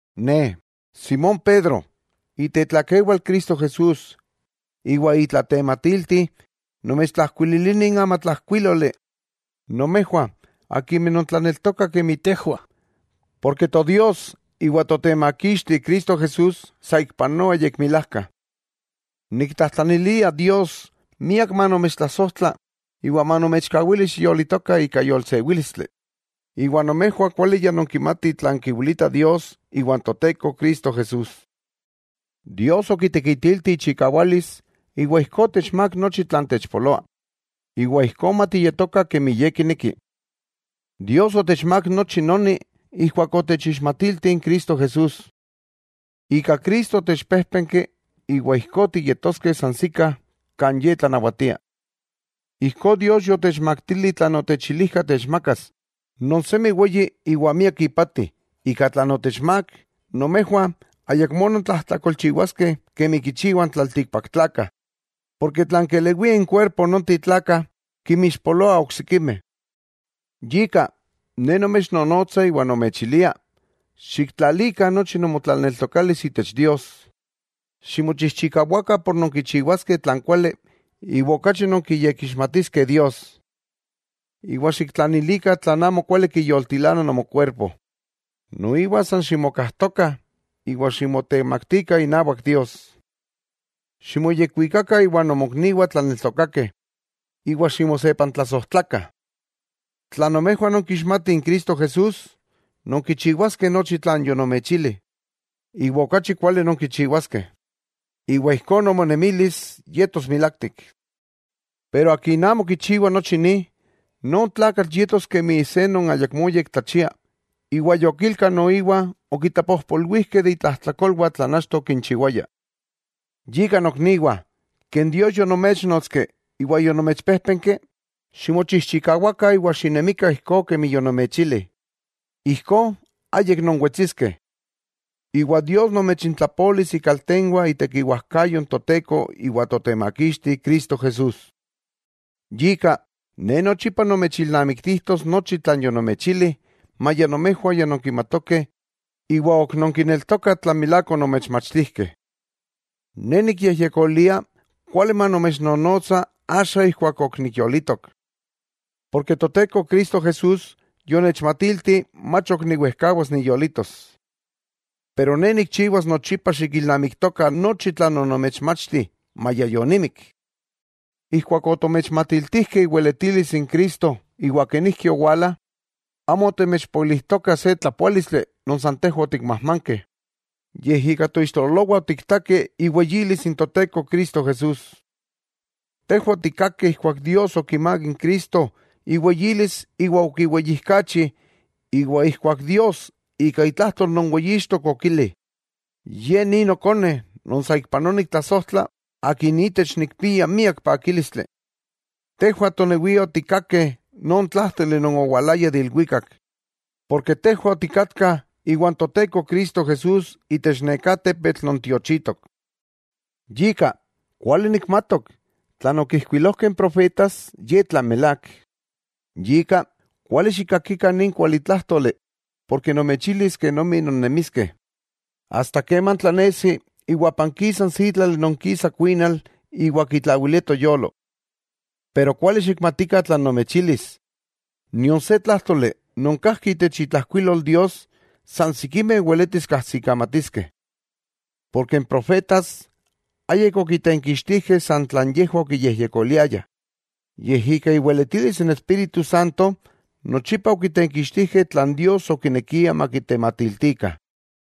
Ne, Simón Pedro, itetlakewal Cristo Jesús iwa itlatematilti, nomechtlajkuililia nin amatlajkuíloli, nomejwah akimeh nontlaneltokah kemi tejwah, porke Todios iwa Totemakixti Cristo Jesús saikpanoa yekmilajka. Niktlajtlanilia Dios miak manomechtlasojtla iwa manomechkawili xiyolitoka ika yolsewílistli, iwa nomejwah kuali ya nonkimatih tlan kiwilita Dios iwa n Toteko Cristo Jesús. Dios okitekitilti ichikawalis iwa ijkó otechmák nochi tlan techpoloa, iwa ijkó matiyetokah kemi Ye kineki. Dios otechmák nochi noni ijkuak otechixmatilti n Cristo Jesús. Ika Cristo otechpéjpenki iwa ijkó tiyetoskeh sansikah kan Ye tlanawatia. Ijkó Dios yotechmaktili tlan otechilijka techmakas non semi weyi iwa miak ipati, ika tlan otechmák, nomejwah ayakmó nontlajtlakolchiwaskeh kemi kichiwah n tlaltikpaktlakah, porke tlan kelewia inkuerpo nonteh tlakah, kinmixpoloah oksikimeh. Yika, ne nomechnonotsa iwa nomechilia: xiktlalikah nochi nomotlaneltokalis itech Dios, ximochijchikawakah por nonkichiwaskeh tlan kuali iwa okachi nonkiyekixmatiskeh Dios, iwa xiktlanilikah tlan amokuali kiyoltilana nomokuerpo, noiwa san ximokajtokah iwa ximotemaktikah inawak Dios. Ximoyekuikakah iwa nomokniwah tlaneltokakeh, iwa ximosepantlasojtlakah. Tla nomejwah nonkixmatih n Cristo Jesús, nonkichiwaskeh nochi tlan yonomechili, iwa okachi kuali nonkichiwaskeh. Iwa ijkó nomonemilis yetos milaktik. Pero akin amo kichiwa nochi ni, non tlakatl yetos kemi se non ayakmó yektlachia, iwa yokilka noiwa okitlapojpolwijkeh de itlajtlakolwah tlan achto okinchiwaya. Yika nokniwah ken Dios yonoméchnotski iwa yonomechpéjpenki, ximochijchikawakah iwa xinemikah ijkó kemi yonomechili, ijkó ayik nonwetsiskeh. Iwa Dios nomechintlapolis ikaltenwah itekiwajkayo n Toteko iwa Totemakixti Cristo Jesús. Yika, ne nochipa nomechilnamiktijtos nochi tlan yonomechili, maya nomejwah ya nonkimatokeh iwa ok nonkineltokah tlan milák onomechmachtijkeh. Ne nikyejyekolia kuali manomechnonotsa axa ijkuak ok niyolitok. Porke Toteko Cristo Jesús yonechmatilti mach ok niwejkawas niyolitos. Pero ne nikchiwas nochipa xikilnamiktokah nochi tlan onomechmachti, maya yonimik. Ijkuak otomechmatiltijkeh iweletilis n Cristo iwa kenijki owala, amo otomechpoilijtokah se tlapoálistli non san tejwah otikmajmankeh, yej ika toixtololowah otiktakeh iweyilis n Toteko Cristo Jesús. Tejwah otikkakeh ijkuak Dios okimák n Cristo iweyilis iwa okiweyijkachi, iwa ijkuak Dios ika itlajtol non weyixtok okili: “Ye ni Nokone non saikpanoa niktlasojtla, Akin itech nikpia miak pakílistli.” Tejwah tonewiah otikkakeh non tlájtoli non owalaya de ilwikak, porke tejwah otikatkah iwan Toteko Cristo Jesús itech neká tepetl non tiochitok. Yika, kuali nikmatok, tlan okijkuilojkeh n profetas ye tlan milák, yika, kuali xikkakikah nin kualitlájtoli, porke nomechilis kenomi non nemiskeh, asta keman tlanesi iwa pankisa n sítlali non kisa kuinal iwa kitlawilia toyolo. Pero kuali xikmatikah tlan nomechilis: nion se tlájtoli non kajki itech itlajkuilol Dios, san sikimeh weletis kajsikamatiskeh, porke n profetas ayik okitenkixtijkeh san tlan yejwah okiyejyekoliayah, yej ika iweletilis n Espíritu Santo nochipa okitenkixtijkeh tlan Dios okinekia makitematiltikah.